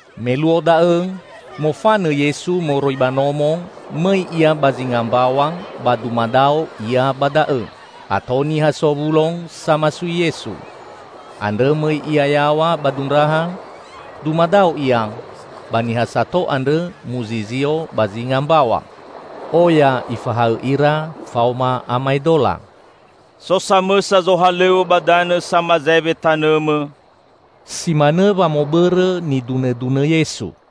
Me luo da'õ, mofanõ Yesu moroi ba nomo mõi Ia ba zinga mbaw̃a ba dumadao Ia ba da'õ. Ato niha sowulo samasui Yesu. Andrõ mõi Ia yaw̃a ba dundraha; dumadao Ia, ba niha sato andrõ muzizio ba zinga mbaw̃a. Oya Ifahaõ ira faoma amaedola. "So samõsa zohalõw̃õ ba danõ samazaewe tanõmõ," si manõ wamõbõrõ nidunõdunõ Yesu.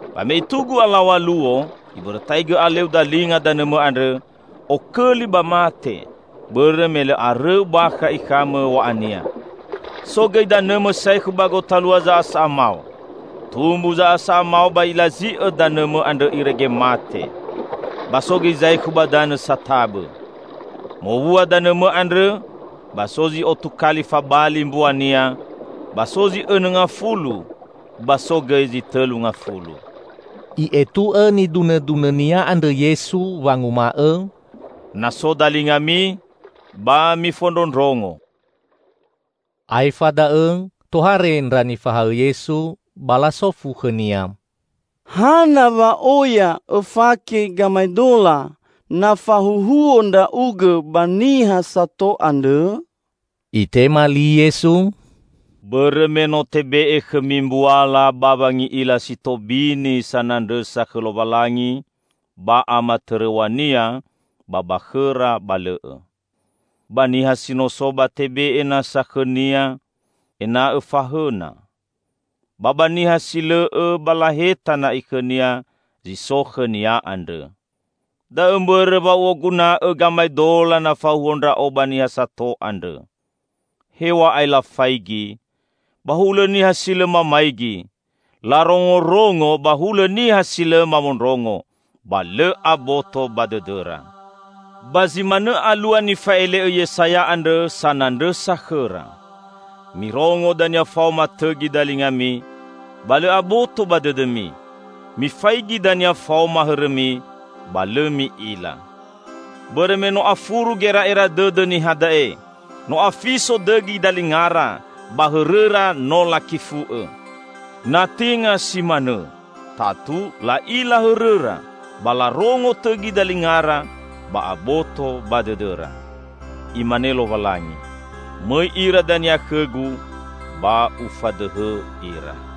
Ba me itugu alaw̃a luo, ibõrõtaigõ aleu dalinga danõmõ andrõ, okõli ba mate, bõrõ me lõ arõu bakha ikhamõ w̃a'ania. So gõi danõmõ saekhu ba gotalua za'asa'a mao. Tumbu za'asa'a mao ba ilazi'õ danõmõ andrõ irege mate. Ba so gõi zaekhu ba danõ satabõ. Mowua danõmõ andrõ, ba so zi otu kali fabali mbuania, ba so zi õnõ ngafulu, ba so gõi zi tõlu ngafulu." I'etu'õ nidunõdunõ-Nia andrõ Yesu wanguma'õ, "Na so dalingami, ba mifondrondrongo!" Aefa da'õ tohare ndra nifahaõ Yesu ba lasofu khõ-Nia, "Hana wa oya Õfake gamaedola na fahuhuo Ndra'ugõ ba niha sato andrõ?" Itema li Yesu, "Bõrõ me no tebe'e khõmi mbuala ba wangi'ila si tobini sanandrõsa khõ Lowalangi ba amatõrõw̃a-Nia, ba ba khõra ba lõ'õ. Ba niha si no so, ba tebe'e nasa khõnia, ena'õ fahõna. Ba ba niha si lõ'õ, ba laheta na'i khõnia zi so khõnia andrõ. Da'õ mbõrõ wa U'oguna'õ gamaedola na fahuhuo Ndra'o ba niha sato andrõ. Hew̃a'ae lafaigi, ba hulõ niha si lõ mamaigi; larongorongo ba hulõ niha si lõ mamondrongo, ba lõ aboto ba dõdõra. Ba zi manõ alua nifa'ele'õ Yesaya andrõ sanandrõsa khõra, 'Mirongo dania faoma tõgi dalingami, ba lõ aboto ba dõdõmi; mifaigi dania faoma hõrõmi, ba lõ mi'ila. Bõrõ me no afuru gera'era dõdõ niha da'e, no afiso dõgi dalingara, ba hõrõra no lakifu'õ. Na tenga si manõ, tatu la'ila hõrõra, ba larongo tõgi dalingara, ba aboto ba dõdõra. Imane Lowalangi, mõi ira dania khõ-Gu, ba Ufadõhõ ira.'"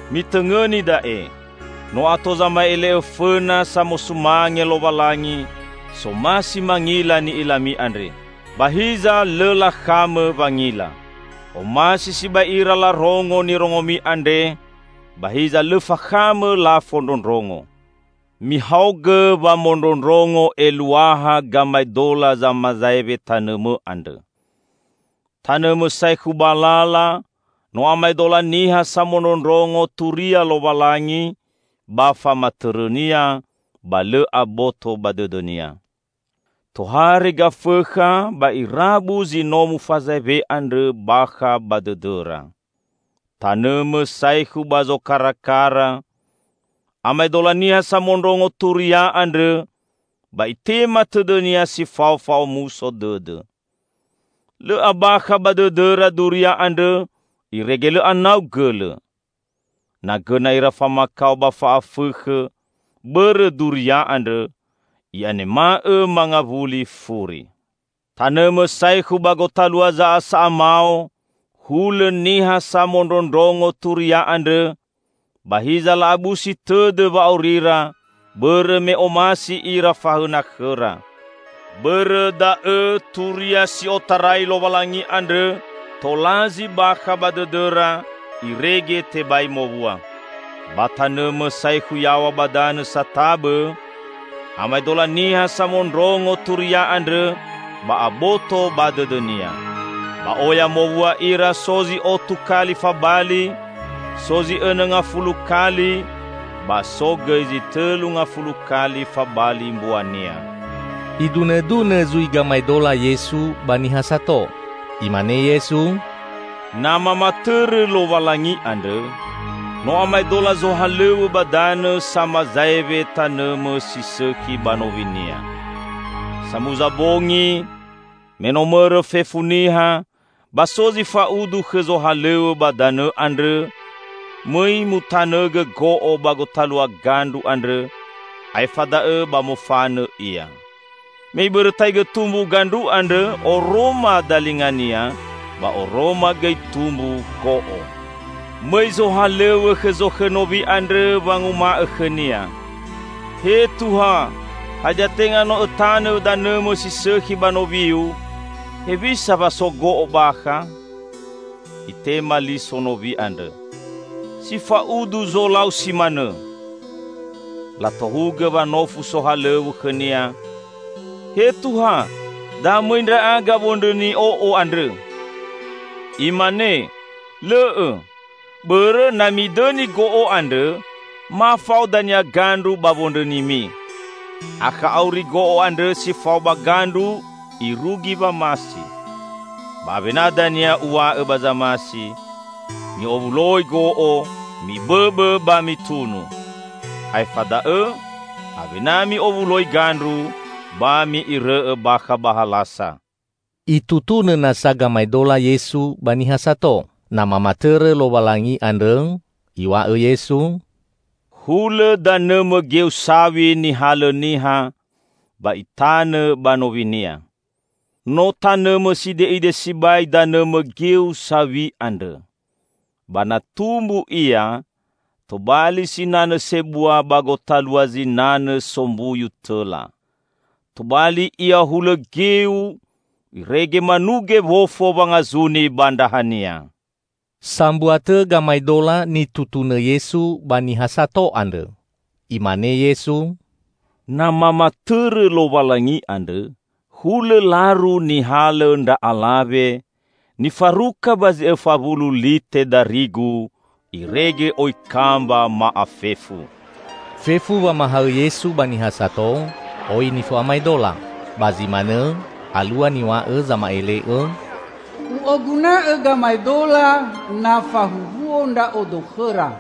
Mitõngõni da'e! No ato zama'ele'õ fõna samosumange Lowalangi, somasi mangila ni'ilami andre. Ba hiza lõ lakhamõ wangila. Omasi sibai ira larongo nirongomi andre, ba hiza lõ fakhamõ lafondrondrongo." "Mihaogõ wamondrondrongo eluaha gamaedola zamazaewe tanõmõ andrõ. Tanõmõ saekhu ba lala, no amaedola niha samondrondrongo turia Lowalangi ba famatõrõ-Nia, ba lõ aboto ba dõdõnia. Tohare Gafõkha ba irabu zi no mufazaewe andrõ bakha ba dõdõra. Tanõmõ saekhu ba zokarakara, amaedola niha samondrongo turia andrõ ba itema tõdõnia si fao fa'omuso dõdõ. Lõ abakha ba dõdõra duria andrõ, irege lõ anau gõlõ. Na gõna ira famakao ba fa'afõkhõ bõrõ duria andrõ, i'anema'õ mangawuli furi. Tanõmõ saekhu ba gotalua za'asa'a mao, hulõ niha samondrondrongo turia andrõ, ba hiza la'abusi tõdõ wa'aurira bõrõ me omasi ira fahõna khõra. Bõrõ da'õ turia si otarai Lowalangi andrõ tolazi bakha ba dõdõra irege tebai mowua. Ba tanõmõ saekhu yaw̃a ba danõ satabõ, amaedola niha samondrongo turia andrõ ba aboto ba dõdõnia. Ba oya mowua ira, so zi otu kali fabali, so zi õnõ ngafulu kali, ba so gõi zi tõlu ngafulu kali fabali mbuania." Idunõdunõ zui gamaedola Yesu ba niha sato. Imane Yesu, "Na mamatõrõ Lowalangi andrõ, no amaedola zohalõw̃õ ba danõ samazaewe tanõmõ si sõkhi ba nowinia. Samuza bongi, me no mõrõ fefu niha, ba so zi fa'udu khõ zohalõw̃õ ba danõ andrõ mõi mutanõgõ go'o ba gotalua gandru andrõ, aefa da'õ ba mofanõ ia. Me ibõrõtaigõ tumbu gandru andrõ, oroma dalingania, ba oroma gõi tumbu go'o. Mõi zohalõw̃õ khõ zokhõ nowi andrõ wanguma'õ khõnia, 'He Tuha, hadia tenga no õtanõ danõmõ si sõkhi ba nowiu? Hewisa wa so go'o bakha?' Itema li sonowi andrõ, 'Si fa'udu zolau si manõ.' Latohugõ wanofu sohalõw̃õ khõnia, 'He Tuha, da mõi ndra'aga wondrõni o'o andrõ?' Imane, 'Lõ'õ! Bõrõ na midõni go'o andrõ, ma fao dania gandru ba wondrõnimi. Akha auri go'o andrõ si fao ba gandru irugi wamasi. Ba awena dania uw̃a'õ ba zamasi: Mi'owuloi go'o, mibõbõ, ba mitunu. Aefa da'õ awena mi'owuloi gandru, ba mi'irõ'õ bakha ba halasa.'" Itutunõ nasa gamaedola Yesu ba niha sato. Na mamatõrõ Lowalangi andrõ, Iw̃a'õ Yesu, "Hulõ danõmõ geu saw̃i nihalõ niha, ba itanõ ba nowinia. No tanõmõ side'ide sibai danõmõ geu saw̃i andrõ. Ba na tumbu ia, tobali sinanõ sebua ba gotalua zinanõ sombuyu tõla. Tobali ia hulõ geu, irege manuge wofo wangazuni ba ndrahania." Sambua tõ gamaedola nitutunõ Yesu ba niha sato andrõ. Imane Yesu, "Na mamatõrõ Lowalangi andrõ, hulõ laru nihalõ ndra alawe, nifaruka ba zi õfa wulu lite darigu, irege oi kamba ma'afefu!" Fefu wamahaõ Yesu ba niha sato oi nifo'amaedola. Ba zi manõ alua niw̃a'õ zama'ele'õ, "U'oguna'õ gamaedola na fahuhuo Ndra'odo khõra;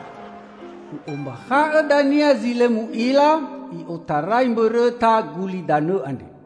U'ombakha'õ dania zi lõ mu'ila i'otarai mbõrõta gulidanõ andre."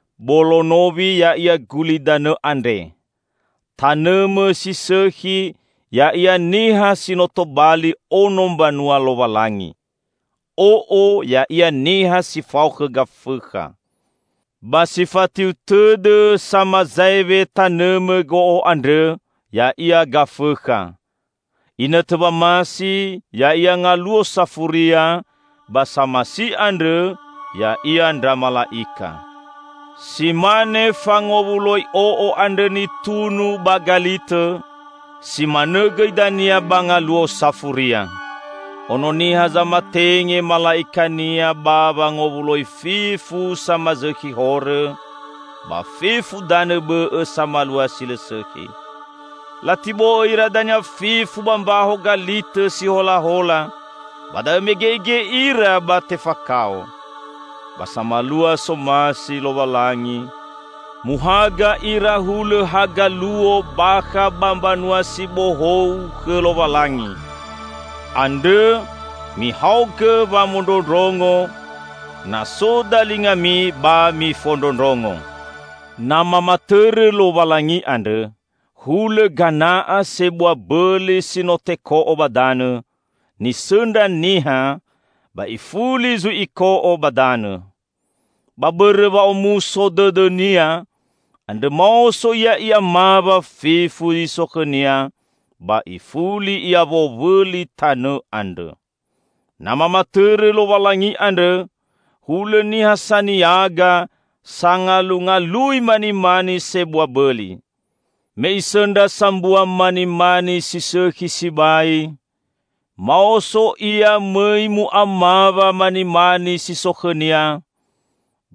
Bolo nowi ya'ia gulidanõ andre. Tanõmõ si sõkhi ya'ia niha si no tobali ono mbanua Lowalangi. O'o ya'ia niha si fao khõ Gafõkha. Ba si fatiu tõdõ samazaewe tanõmõ go'o andrõ ya'ia Gafõkha. Inõtõ wamasi ya'ia Ngaluo Safuria, ba samasi andrõ ya'ia ndra mala'ika. Si mane fangowuloi o'o andrõ nitunu ba galitõ, si manõ gõi dania ba Ngaluo Safuria. Ono Niha zamatenge mala'ika-Nia ba wangowuloi fefu samazõkhi horõ, ba fefu danõ bõ'õ samalua si lõ sõkhi. Latibo'õ ira dania fefu ba mbaho galitõ si holahola; ba da'õ mege'ege ira ba tefakao. Ba samalua somasi Lowalangi, muhaga ira hulõ haga luo bakha ba Mbanua si Bohou khõ Lowalangi. Andrõ, mihaogõ wamondrondrongo, na so dalingami ba mifondrondrongo!" "Na mamatõrõ Lowalangi andrõ, hulõ gana'a sebua bõli si no teko'o ba danõ, nisõndra niha, ba ifuli zui iko'o ba danõ. Ba bõrõ wa'omuso dõdõnia, andrõ maoso ia i'amawa fefu zi so khõnia, ba ifuli ia wowõli tanõ andrõ." "Na mamatõrõ Lowalangi andrõ, hulõ niha saniaga, sangalungalui manimani sebua bõli. Me isõndra sambua manimani si sõkhi sibai, maoso ia mõi mu'amawa manimani si so khõnia,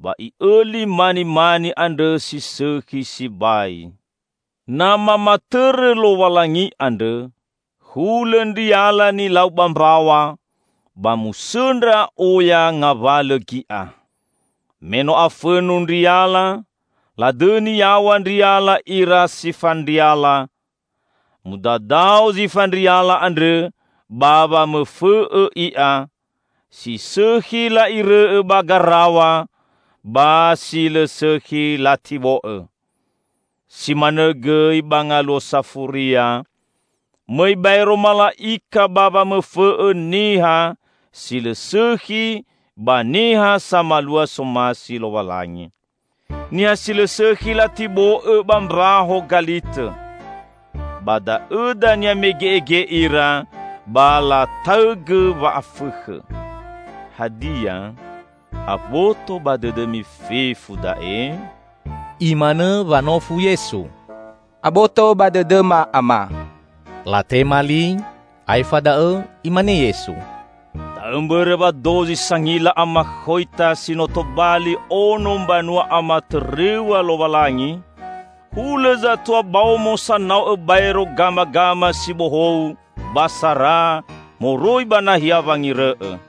ba i'õli manimani andrõ si sõkhi sibai." "Na mamatõrõ Lowalangi andrõ, hulõ ndriala nilau ba mbaw̃a, ba musõndra oya ngawalõ gi'a. Me no afõnu ndriala, ladõni yaw̃a ndriala ira si fandriala. Mudadao zi fandriala andrõ ba wamõfõ'õ i'a; si sõkhi la'irõ'õ ba garaw̃a, ba si lõ sõkhi latibo'õ. Si manõ gõi ba Ngaluo Safuria, mõi baero mala'ika ba wamõfõ'õ niha si lõ sõkhi ba niha samalua somasi Lowalangi. Niha si lõ sõkhi latibo'õ ba mbaho galitõ. Ba da'õ dania mege'ege ira ba lataõgõ wa'afõkhõ." "Hadia, aboto ba dõdõmi fefu da'e?" Imanõ wanofu Yesu. "Aboto ba dõdõma, Ama!" latema li. Aefa da'õ Imane Yesu, "Da'õ mbõrõ wa dozi sangila amakhoita si no tobali ono mbanua amatõrõw̃a Lowalangi, hulõ zatua baomo sanao'õ baero gamagama si bohou ba sara moroi ba nahia wangirõ'õ."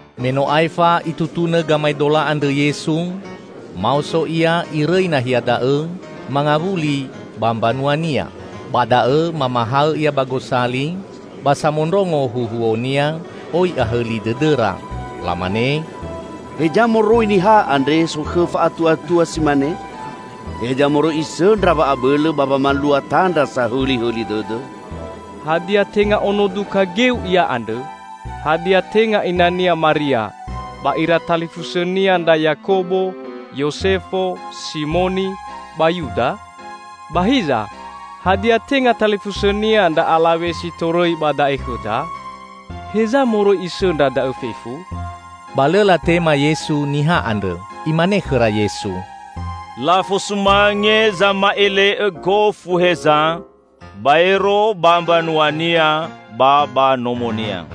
Me no aefa Itutunõ gamaedola andrõ Yesu, maoso Ia irõi nahia da'õ, mangawuli ba mbanua-Nia. Ba da'õ mamahaõ Ia ba gosali, ba samondrongo huhuo-Nia oi ahõli dõdõra. Lamane, "Heza moroi niha andre sokhõ fa'atuatua si mane? Heza moroi Isõndra wa'abõlõ ba wamalua tandra sahõlihõli dõdõ? Hadia tenga ono duka geu Ia andrõ? Hadia, tenga ina-Nia Maria, ba ira talifusõ-Nia ndra Yakobo, Yosefo, Simoni ba Yuda? Ba hiza, hadia tenga talifusõ-Nia ndra alawe si torõi ba da'e khõda? Heza moroi Isõndra da'õ fefu?" Ba lõ latema Yesu niha andrõ. Imane khõra Yesu, "Lafosumange zama'ele'õ gofu heza, baero ba mbanuania ba ba nomonia."